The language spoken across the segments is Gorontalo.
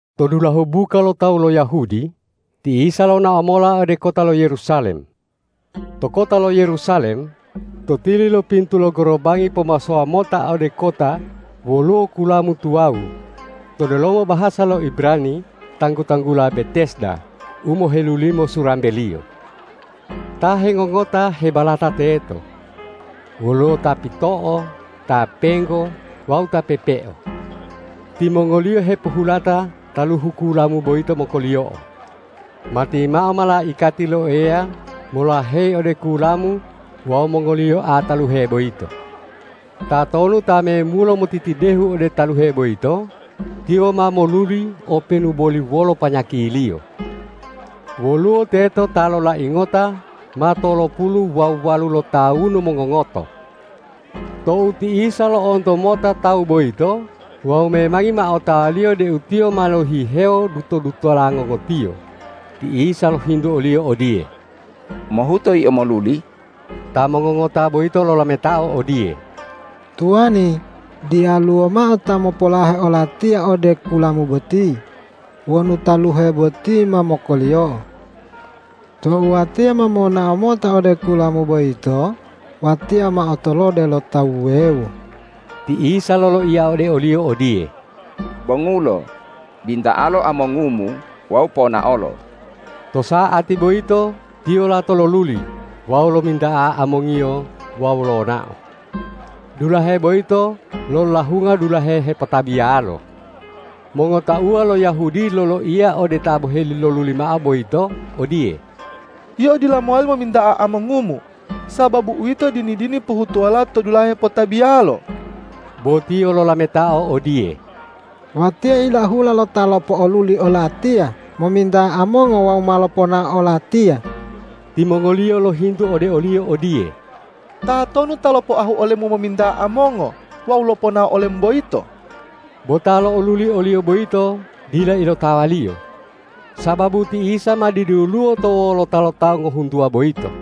To dulahu buka lo tawu lo Yahudi, ti Isa lonao mola ode kota lo Yerusalem. To kota lo Yerusalem, to tili lo pintu lo gorobangi pomasowa mota ode kota woluwo kulamu tuwawu, to delomo bahasa lo Ibrani tanggu-tanggula Betesda u mohelulimo surambeliyo. Ta hengongota hebalata teto. Woluwo ta pito'o, ta penggo wawu ta pepeo. Timongoliyo hepohulata taluhu kulamu boyito mokoliyo'o. Matimao malaikati lo Eya molaheyi ode kulamu wawu mongoliyoa taluhe boyito. Tatonu ta memulo motitidehu ode taluhe boyito, tiyo ma moluli openu boli wolo panyakiliyo. Woluwo teto ta lolai ngota ma tolopulu wawu walu lotawunu mongongoto. Tou ti Isa lo'onto mota tawu boyito wawu memangi ma otawa-Liyo deu tiyo ma lohihewo duto-dutola ngongotiyo, ti Isa lohintu oliyo odiye,”Mohuto yio moluli?” Ta mongongota boyito lolametao odiye,”Tuwani, diyaluwo mao ta mopolahe olatiya ode kulamu boti wonu taluhe boti ma mokoliyo'o. Tou watiya ma monao mota ode kulamu boyito, watiya ma otolode lo tawu wuwewo.” Ti Isa loloiya ode oliyo odiye,”Bongulo, binta'alo amongumu wawu ponaolo.” To sa'ati boyito tiyo lato loluli wawu lominta'a amongiyo wawu lonao. Dulahe boyito lolahunga dulahe hepotabiyalo. Mongotauwa lo Yahudi loloiya ode ta boheli loluli mao boyito odiye,”Yio dila mowali mominta'a amongumu, sababu uwito dini-dini pohutuwola to dulahe hepotabiyalo.” Bo tiyo lolametao odiye,”Watiya ilahula lo Ta lopo'oluli olatiya mominta'a amongo wawu ma loponao olatiya.” Timongoliyo lohintu ode oliyo odiye,”Tatonu ta lopoahu olemu mominta'a amongo wawu loponao olemu boyito?” Bo ta lo'oluli oliyo boyito dila ilotawaliyo, sababu ti Isa ma diduluwo to wolota lo tawu ngohuntuwa boyito.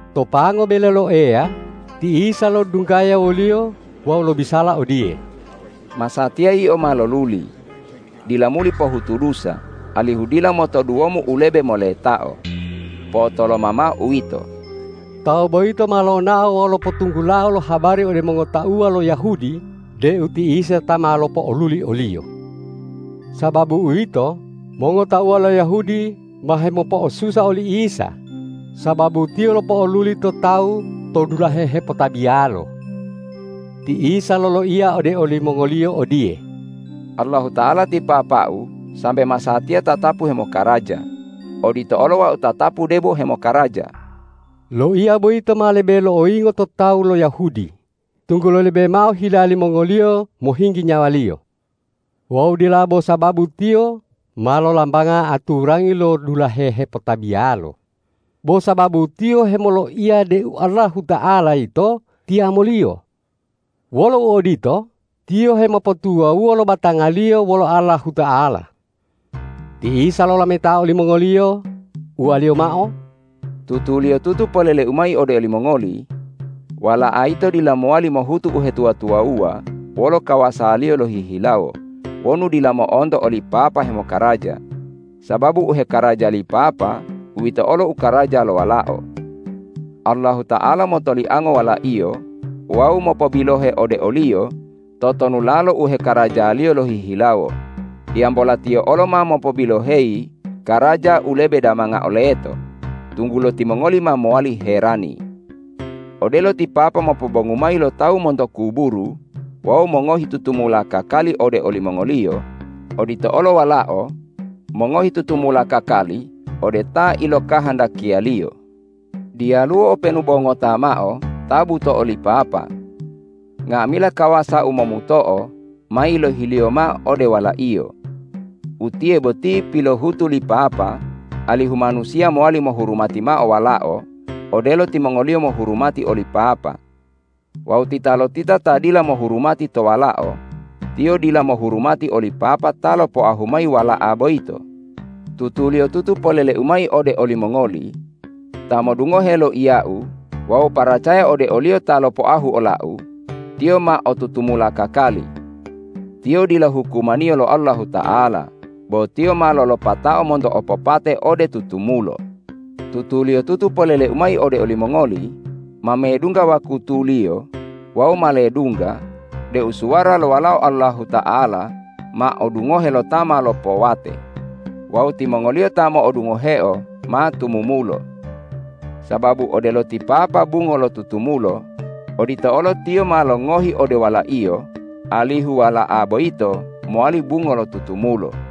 To pango bele lo Eya ti Isa lodunggaya woliyo wawu lobisala odiye,”Masatiya yio ma loluli. Dila muli pohutu dusa, alihu dila motoduwomu u lebe moletao. Po'otoloma mao uwito.” Tawu boyito ma lonao wawu lopotunggulao lo habari ode mongotauwa lo Yahudi deu ti Isa ta ma lopo'oluli oliyo. Sababu uwito, mongotauwa lo Yahudi ma hemopo'osusa oli Isa, sababu Tiyo lopo'oluli to tawu to dulahe hepotabiyalo. Ti Isa loloiya ode olimongoliyo odiye,”Allahuta'ala ti Papa-U sambe masatiya tatapu hemokaraja, odito olo Wau tatapu debo hemokaraja.” Loiya boyito ma lebe lo'oyingo to tawu lo Yahudi, tunggulo lebe mao hila limongoliyo mohinggi nyawa-Liyo. Wawu dila bo sababu Tiyo ma lolambanga aturangi lo dulahe hepotabiyalo, bo sababu Tiyo hemoloiya deu Allahuta'ala yito Tiyamo-Liyo. Wolo uodito, Tiyo hemopotuwawuwo lo batanga-Liyo wolo Allahuta'ala. Ti Isa lolametao olimongoliyo, uwa-Liyo mao,”Tutuliyotutu polele-U mayi ode olimongoli: Wala'a yito dila mowali mohutu uhetuwa-tuwawuwa wolo kawasa-Liyo lohihilawo wonu dila mo'onto oli Papa hemokaraja, sababu u hekaraja li Papa, uwito olo u karaja lo Walao. Allahuta'ala motoliango Wala-Iyo wawu mopobilohe ode o-Liyo totonulalo u hekaraja-Liyo lohihilawo, hiyambola Tiyo olo ma mopobiloheyi karaja u lebe damangao leto, tunggulo timongoli ma mowali herani. Odelo ti Papa mopobongu mayi lo tawu monto kuburu wawu mongohi tutumula kakali ode olimongoliyo, odito olo Walao mongohi tutumula kakali ode ta ilokahandakiya-Liyo. Diyaluwo openu bo ngota mao ta buto'o li Papa. Nga'amila kawasa u momuto'o ma yilohi-Liyo mao ode Wala-Iyo. Utiye boti pilohutu li Papa alihu manusiya mowali mohurumati mao Walao odelo timongoliyo mohurumati oli Papa. Wawu titalotita ta dila mohurumati to Walao, tiyo dila mohurumati oli Papa ta lopoahu mayi Wala'a boyito. Tutuliyotutu polele-U mayi ode olimongoli: Ta modungohe loiya-U wawu paracaya ode o-Liyo ta lopoahu ola-U, tiyo ma o tutumula kakali. Tiyo dila hukumaniyo lo Allahuta'ala, bo tiyo ma lolopatao monto opopate ode tutumulo. Tutuliyotutu polele-U mayi ode olimongoli: Ma medungga wakutuliyo wawu ma ledungga deu suwara lo Walao Allahuta'ala ma odungohe lo ta ma lopowate. Wawu timongoliyo ta modungoheo ma tumumulo. Sababu odelo ti Papa bungo lo tutumulo, odito olo Tiyo ma longohi ode Wala-Iyo alihu Wala'a boyito mowali bungo lo tutumulo.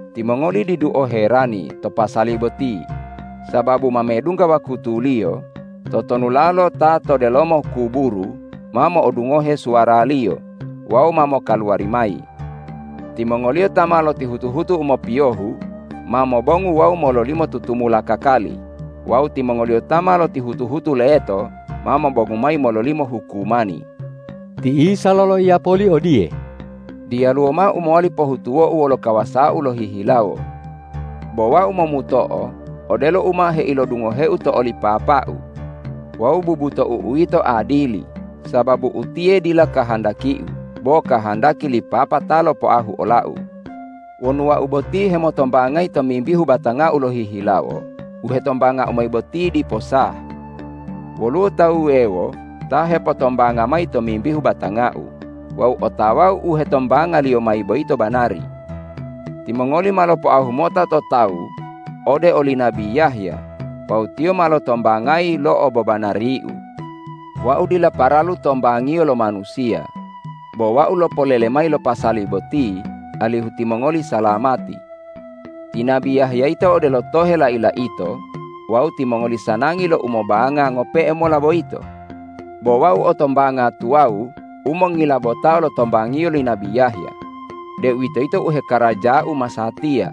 Timongoli didu oherani to pasali boti, sababu ma medungga wakutuliyo, totonulalo ta to delomo kuburu ma mo'odungohe suwara-Liyo wawu ma mokaluwari mayi. Timongoliyo ta ma lotihutu-hutu u mopiyohu ma mobongu wawu mololimo tutumula kakali wawu timongoliyo ta ma lotihutu-hutu leto ma mobongu mayi mololimo hukumani.” Ti Isa loloiya poli odiye,”Diyaluwo mao u mowali pohutuwo-U wolo kawasa-U lohihilawo. Bo Wau momuto'o odelo u ma heilodungohe-U to oli Papa-U. Wawu bubutou-U yito adili, sababu utiye dila kahandaki-U, bo kahandaki li Papa ta lopoahu ola-U. Wonu Wau boti hemotombangayi tomimbihu batanga-U lohihilawo, u hetombanga-U mayi boti dipo sah. Woluwo ta wuwewo ta hepotombanga mayi tomimbihu batanga-U wawu otawa-U u hetombangaliyo mayi boyito banari. Timongoli ma lopoahu mota to tawu ode oli nabi Yahya wawu tiyo ma lotombangayi lo obobanari-U. Wau dila paralu tombangiyo lo manusiya. Bo Wau lopolele mayi lo pasali boti alihu timongoli salamati. Ti nabi Yahya yito odelo tohe lai-laito wawu timongoli sanangi lo u mobanga ngope'e mola boyito. Bo Wau o tombanga tuwawu u mongilabotao lo tombangiyo li nabi Yahya, deuwitoyito u hekaraja-U masatiya,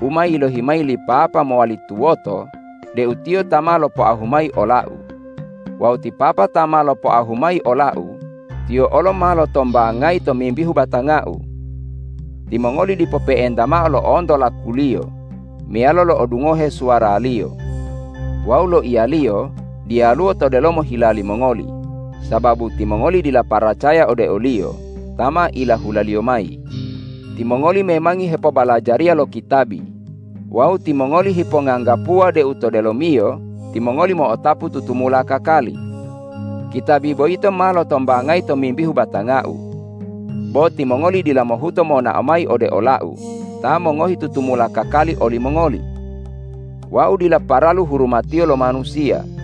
u ma yilohi mayi li Papa mowali tuwoto deu Tiyo ta ma lopoahu mayi ola-U. Wawu ti Papa ta ma lopoahu mayi ola-U, Tiyo olo ma lotombangayi tomimbihu batanga-U. Timongoli dipo pe'enta mao lo'onto laku-Liyo meyalo lo'odungohe suwara-Liyo. Wawu loiya-Liyo diyaluwo to delomo hila limongoli, sababu timongoli dila paracaya ode o-Liyo ta ma ilahula-Liyo mayi. Timongoli memangi hepobalajariya lo kitabi wawu timongoli hiponganggapuwa deu to delomiyo timongoli mo'otapu tutumula kakali. Kitabi boyito ma lotombangayi tomimbihu batanga-U. Bo timongoli dila mohuto monao mayi ode ola-U ta mongohi tutumula kakali olimongoli. Wau dila paralu hurumatiyo lo manusiya.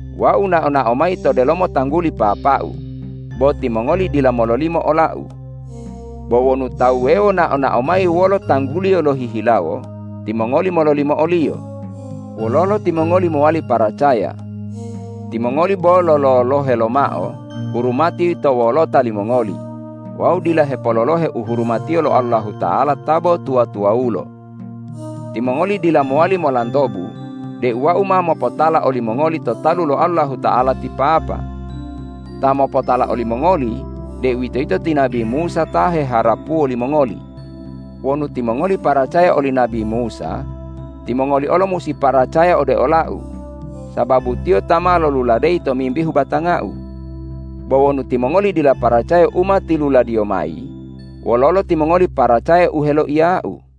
Wau nao-nao mayi to delomo tangguli Papa-U, bo timongoli dila mololimo ola-U. Bo wonu ta wuwewo nao-nao mayi wolo tangguliyo lohihilawo, timongoli mololimo oliyo. Wololo timongoli mowali paracaya? Timongoli bo lololohe lomao hurumati to wolota limongoli wawu dila hepololohe u hurumatiyo lo Allahuta'ala ta bo tuwa-tuwawulo. Timongoli dila mowali molantobu deu Wau ma mopotala olimongoli to talu lo Allahuta'ala ti Papa. Ta mopotala olimongoli, deuwitoyito ti nabi Musa ta heharapuwo limongoli. Wonu timongoli paracaya oli nabi Musa, timongoli olo musi paracaya ode ola-U, sababu tiyo ma loluladeyi tomimbihu batanga-U. Bo wonu timongoli dila paracaya u ma tiluladiyo mayi, wololo timongoli paracaya u heloiya-U?”